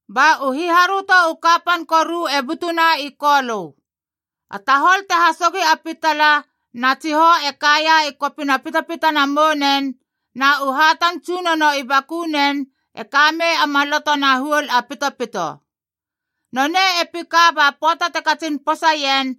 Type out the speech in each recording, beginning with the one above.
Ba u hiharöto u kapan koru e butuna i Kolö. A tahol te hasogi a pitala, na tsihou e kaia i kopina pitapitana mounen, na u hatan tsunono i bakunen e ka mei a maloto na huol a pitopito. Nonei e pika ba pöata te katsin posaien,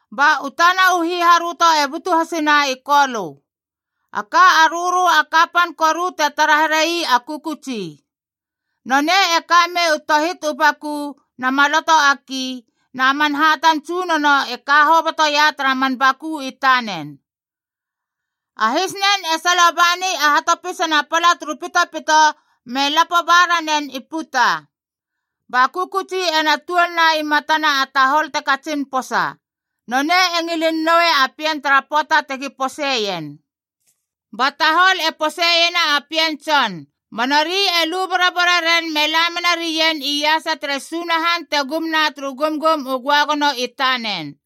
Ba u tana u hiharöto e butu hasina i Kolö. A ka rörö a kapan koru te tara here ii a kökötsi. Nonei e ka mei u tohit u baku na maloto a ki, na man hatan tsunono e ka hobotoia tara man baku i tanen. A hisnen e salo bani a hatopisana pala turu pitopito me lapo ba ranen i puta. Ba kökötsi ena tuolna i matana a tahol te katsin posa. Nonei e ngilin noui a pien tara pöata tegi poseien. Ba tahol e poseiena a pien tson,c ba nori e lu borobore ren me la menarien iasa tere Sunahan te gum na turu gumgum u göagono i tanen.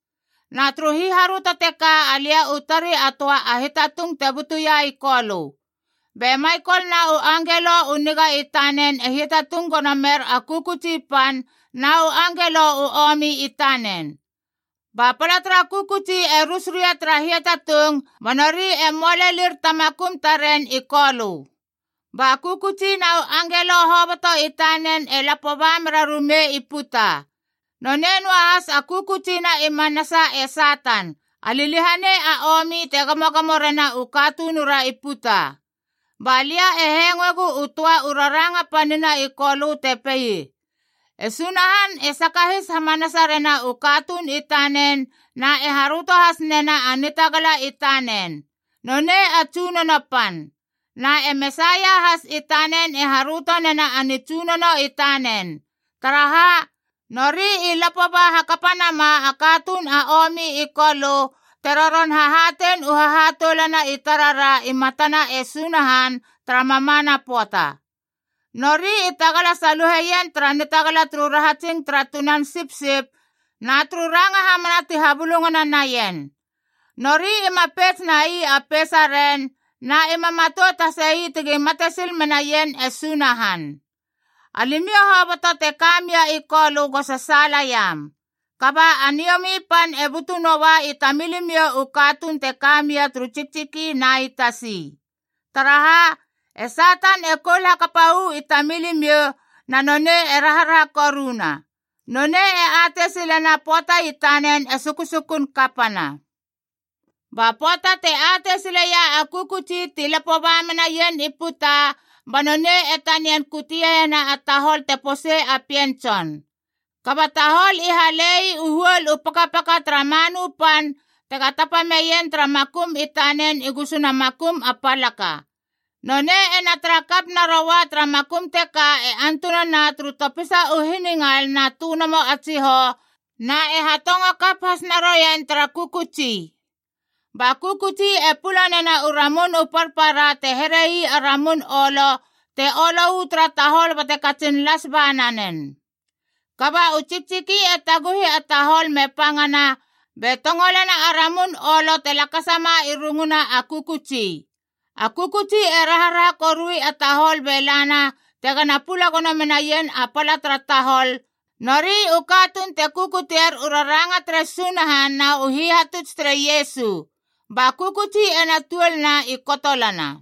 Na turu hiharöto teka alia u tari a töa a hiatatung te butuia i Kolö. Be Maikole na u angelo u niga i tanen e hiatatung gono mer a kökötsi pan na u angelo u omi i tanen. Ba pala tara kökötsi e rus ria tara hiatatung ba nori e möa lelir ta makum taren i Kolö. Ba kökötsi na u angelo hoboto i tanen e lapo ba merarumei i puta. Nonei noa has a kökötsi na i manasa e Satan, a liliahanei a omi te gamogamo rena u katunura i puta. Ba lia e hengoegu u töa u raranga panina i Kolö te pei: “E Sunahan e sakahis hamanasa rena u katuun i tanen na e haröto has nena a nitagala i tanen. Nonei a Tsunono Pan. Na e Mesaia has i tanen e haröto nena a nitsunono i tanen. Taraha? Nori i lapo ba hakapa nama a katuun a omi i Kolö te roron hahatein u hahatoulana i tarara i matana e Sunahan tara mamana pöata. Nori i tagala saluheien tara nitagala turu rahatsing tara Tunan Sipsip na turu ranga hamana ti habulungana naien. Nori ima peits nai a peisaren, na ima matout hasei tegi mate sil menaien e Sunahan. Alimiou hoboto te ka mia i Kolö go sasaala iam! Kaba a niomi pan e butu noa i tamilimiou u katuun te ka mia turu tsiktsiki na i tasi. Taraha? E Satan e koul hakapa uu i tamilimiou na nonei e raharaha koruna. Nonei e atei silena a pöata i tanen e sukusukun kapana.” Ba pöata te atei sileia a kökötsi ti lapo ba menaien i puta, ba nonei e tanian kuteiena a tahol te posei a pien tson. Kaba tahol i hale ii u huol u pakapaka tara manu pan tega tapa meien tara makum i tanen i gusuna makum a palaka. Nonei ena tara kap naroua tara makum teka antunana turu topisa u hiningal na tönomo a tsihou,f na e hatongo kap has naroien tara kökötsi. Ba kökötsi e pula nena u ramun u parpara te here ii a ramun olo, te olo uu tara tahol bate katsin las ba nanen. Kaba u tsiktsiki e taguhi a tahol me pangana be tongolena a ramun olo te lakasama i runguna a kökötsi. A kökötsi e raharaha korui a tahol be lana tegana pula gono menaien a pala tara tahol, nori u katuun te kukutier u raranga tere Sunahan na u hihatuts tere Iesu. Ba kökötsi ena tuolna i kotolana.